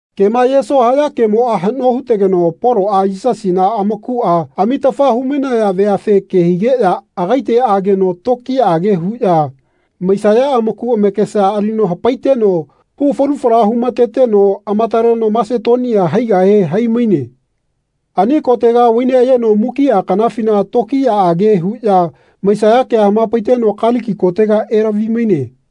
Kema ayeso haya kemoꞌa haꞌno hutegeno Poloꞌa Yisasina amakuꞌa amitafa humainaya veafe ke higeꞌya agaite ageno tokiyaꞌage huꞌya maisaya amaku amakesa alino hapaiteno hu falu fala humateteno amataleno Masetonia haigahe haimaine. Ani kotega vai neꞌayeno mukiꞌa kanafina tokiyaꞌage huꞌya maisaya kea hamapaiteno Kaliki kotega elavi-maine.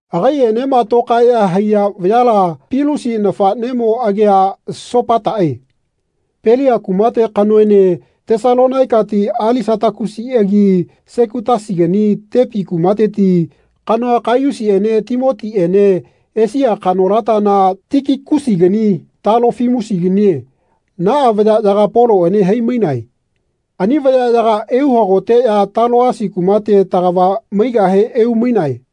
Agaiꞌenema tokaeꞌya haiya vayala Pilusi nafaꞌnemo agia Sopataꞌe Pelia kumate kanoene Tesalonaikati Alisatakusiꞌagi Sekutasigani Tepi kumateti kanoa Kaiyusiꞌene Timotiꞌene Esia kanolatana Tikikusigani Talofimusiganie naꞌa vayaꞌyaga Poloꞌene hai-mainae. Ani vayaꞌyaga euhagoteꞌya Taloasi kumate tagava maigahe eumainae.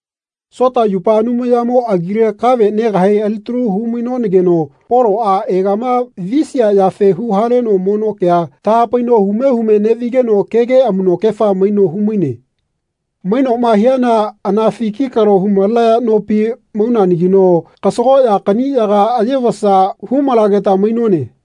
Sota yupa Anumayamo agile kave negahe alitalu humainonageno Poloꞌa egama visia yafe huhaleno mono kea tahapaino hume hume neꞌvigeno kege amuꞌnokefa maino humaine. Mainoꞌma hiana anafi kikalo humalenaya nopi maunanagino kasagoꞌya kaꞌniꞌyaga ayevasa humalageta mainone.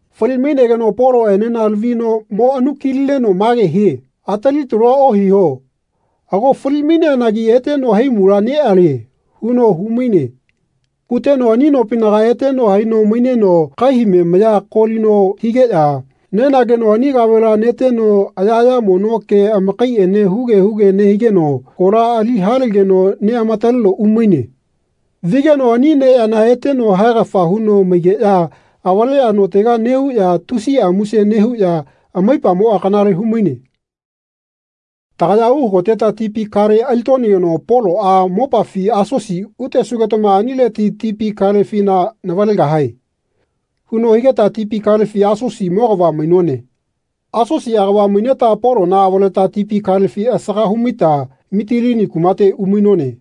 Fali-mainegeno Poloꞌenena lavino mo anu-kilineno mage hie “Atali talua ohiho. Ago fali-maineanagi eteno haimula neꞌalie.” huno humaine. Huteno ani nopinaga eteno haino maineno kaihame maya kolino higeꞌya nenageno ani kavela neteno ayaꞌaya mono ke amakaiꞌene huge huge nehigeno kola ali halegeno neꞌamataleno umaine. Vigeno ani neyana eteno haegafa huno maigeꞌya avaleꞌya notega neꞌuꞌya tusiꞌa muse nehuꞌya amaipamoꞌa kanale humaine. Tagaya uhagoteta tipi kale alitonageno Poloꞌa “Mopafi Asosi utesugetama anileti tipi kalefina navalegahae.” huno higeta tipi kalefi Asosi mogava mainone. Asosi agava maineta Polona avaleta tipi kalefi asaga humaita Mitilini kumate umainone.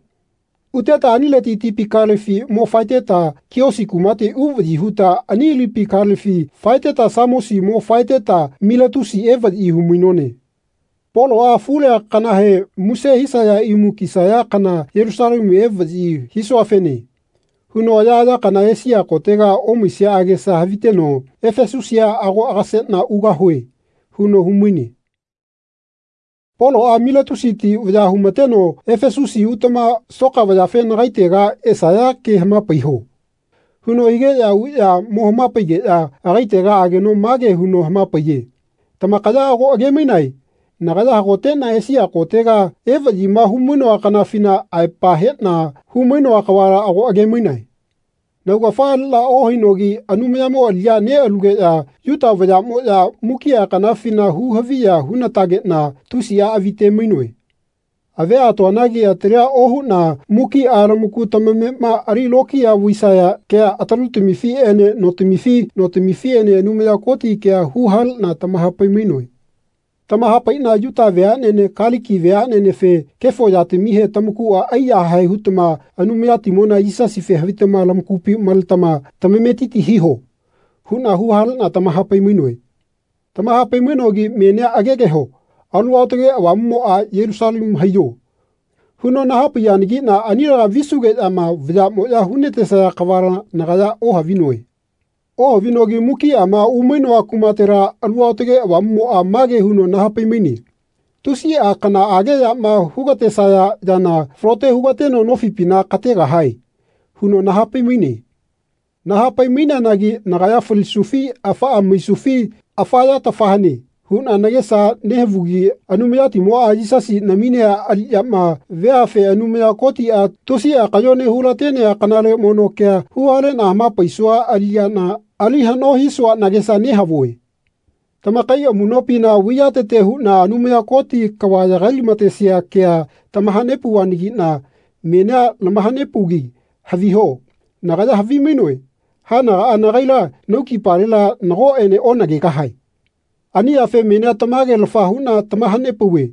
Uteta anileti tipi kalefi mo faeteta Kiosi kumate uvaꞌyi huta ani lipi kalefi faeteta Samosi mo faeteta Miletusi evaꞌyi humainone. Poloꞌa “Afulea kanahe muse hisaya imu kisaya kana Yelusalemu evaꞌyi hisuafene.” huno ayaꞌaya kana Esia kotega omaisia agesa haviteno “Efesusia ago agaseꞌna ugahue.” huno humaine. Poloꞌa Miletusiti vaya humateno “Efesusi utama soka vayafe nagaitega esaya ke hamapaiho.” huno higeꞌya uꞌya mo hamapaigeꞌya agaitega ageno mage huno hamapaiye tamakaya ago agemainae nagaya hagoteꞌna Esia kotega evaꞌyima humainoa kanafina aepa heꞌna humainoa kavala ago agemainae. Naugafa aliꞌna ohainogi Anumayamo aliꞌya neꞌalugeꞌya Yuta vayaꞌmoꞌya mukiꞌa kanafina hu-haviya hunatageꞌna tusiꞌa avite-mainoe. Avia atoanagi atalia ohuꞌna mukiꞌa lamaku tamamema ali lokiya vaisaya kea atalutamifiꞌene notamifi notamifiꞌene Anumaya Koti kea huhaleꞌna tamahapai-mainoe. Tamahapaiꞌna Yuta veaꞌnene Kaliki vayaꞌnenefe “Kefo yatamihe tamakuꞌa aiyahae hutama Anumayatimona Yisasife havitama lamakupi maletama tametiti hiho.” huꞌna huhaleꞌna tamaha-pai-mainoe. Tamahapai-mainogi menia agegeho Alu Aotage Avamuꞌmoꞌa “Yelusalemu haiyo.” huno nahapaiyanagiꞌna anilega visugeꞌyama vayaꞌmoꞌya hunatesaya kavala nagaya ohavinoe. Ohavinogi mukiꞌama umainoa kumatela Alu Aotage Avamuꞌmoꞌa mage huno nahapai-maine “Tusiꞌa kanaꞌage yama hugatesaya yana falote hugateno nofipina kategahae.” huno nahapai-maine. Nahapai-maineanagi nagaya falisufi afaꞌa maisufi afa yatafa hane huꞌna nagesa nehavugi Anumayatimoꞌa Yisasi naminea aliꞌyama, veafe Anumaya Kotiꞌa tusiꞌa kayone hulatenea kanale mono kea huhaleꞌna hamapaisua aliꞌyana ali haꞌno hisua nagesa nehavue. Tamakai amuꞌnopina vaiyatete huꞌna Anumaya Koti kava yagai-lamatesia kea tamahanepauvanagiꞌna menia lamahanepaugi haviho nagaya havimainoe haenagaꞌa nagaila naukipalela nagoꞌene onagegahae. Ani yafe menia tamagelafa huꞌna tamahanepauve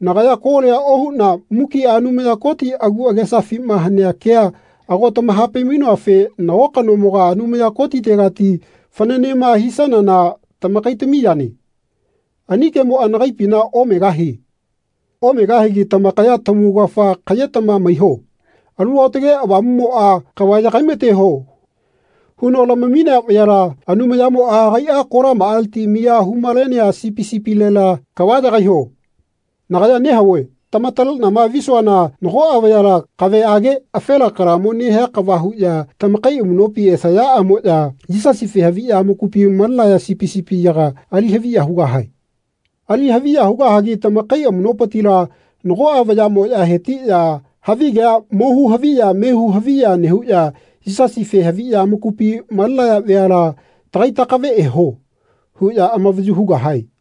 nagaya kolia ohuꞌna mukiꞌa Anumaya Koti agu agesafima hanea kea ago tamahapai-mainoafe nago kanomoga Anumaya Kotitegati fananema hisanana tamakaitami yane. Ani kemoꞌa nagaipina omegahie. Omegahigi tamakaya tamaugafa kaꞌyetama maiho. Alu Aotage Avamuꞌmoꞌa “Kava yagai-mateho.” huno lamaminea vayala, Anumayamoꞌa agaiꞌa kolamaꞌaleti miya humalenea sipi sipilelela kava yagaiho. Nagaya nehavue tamataleꞌnama visuana nagoꞌa vayala, kaveꞌage afela kalamo nehia kava huꞌya tamakai amuꞌnopi esayaꞌamoꞌya Yisasife haviꞌya amakupi malenaya sipi sipiyaga ali haviya hugahae. Ali haviya hugahagi tamakai amuꞌnopitila nagoꞌa vayaꞌmoꞌya hetiꞌya havigea mohu haviya mehu haviya nehuꞌya Yisasife haviꞌya amakupi malenaya veala “Tagai takave eho.” huꞌya amavayu hugahae.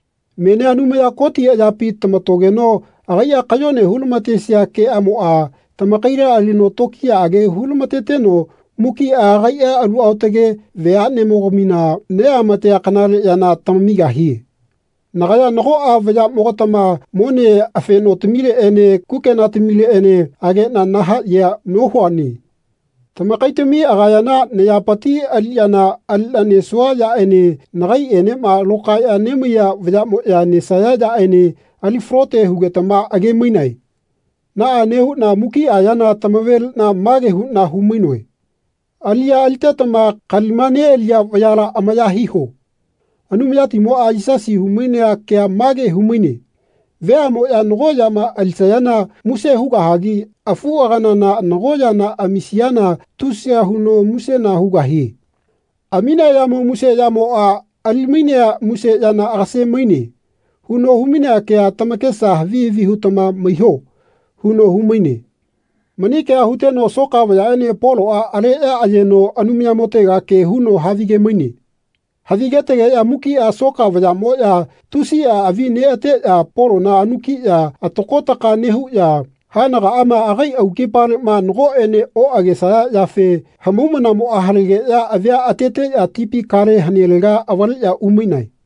Menia Anumaya Koti ayapi tamatogeno agaiꞌa kayone hulamatesia keꞌamoꞌa tamakaila alino tokiyaꞌage hulamateteno mukiꞌa agaiꞌa alu aotage veaꞌneꞌamogamima neꞌamatea kanale yana tamamigahie. Nagaya nagoꞌa vayaꞌmogatama mone afenotamileꞌene kukenatamileꞌene ageꞌna nahaꞌyea nohuane. Tamakaitamia agayana nayapiti aliꞌyana aliꞌna nesua yaꞌene nagaiꞌenema lokaeꞌya nemaiya vayaꞌmoꞌya nesaya yaꞌene ali falote hugetama age-mainae. Naꞌa nehuꞌna mukiꞌa yana tamaveliꞌna mage huꞌna humainoe “Aliꞌya alitetama kalima neꞌaliya vayala amaya hiho.” Anumayatimoꞌa Yisasi humainea kea mage humaine “Veaꞌmoꞌya nago yama alisayana muse hugahagi afuꞌaganana nago yana amisiana tusiya huno musena hugahie. Aminea yamo muse yamoꞌa ali-mainea muse yana agase-maine.” huno humainea kea tamakesa havi havi hutama maiho huno humaine. Mani kea huteno soka vayaꞌene Poloꞌa aleꞌya ayeno Anumayamotega ke huno havige-maine. Havigetegeꞌya mukiꞌa soka vayaꞌmoꞌya tusiꞌa avi neꞌateꞌya Polona anukiꞌya atako ataka nehuꞌya haenagaꞌama agai aukipaleꞌma nagoꞌene oꞌagesaya yafe hamaumana halegeꞌya avia ateteꞌya tipi kale hanelega avaleꞌya umainae.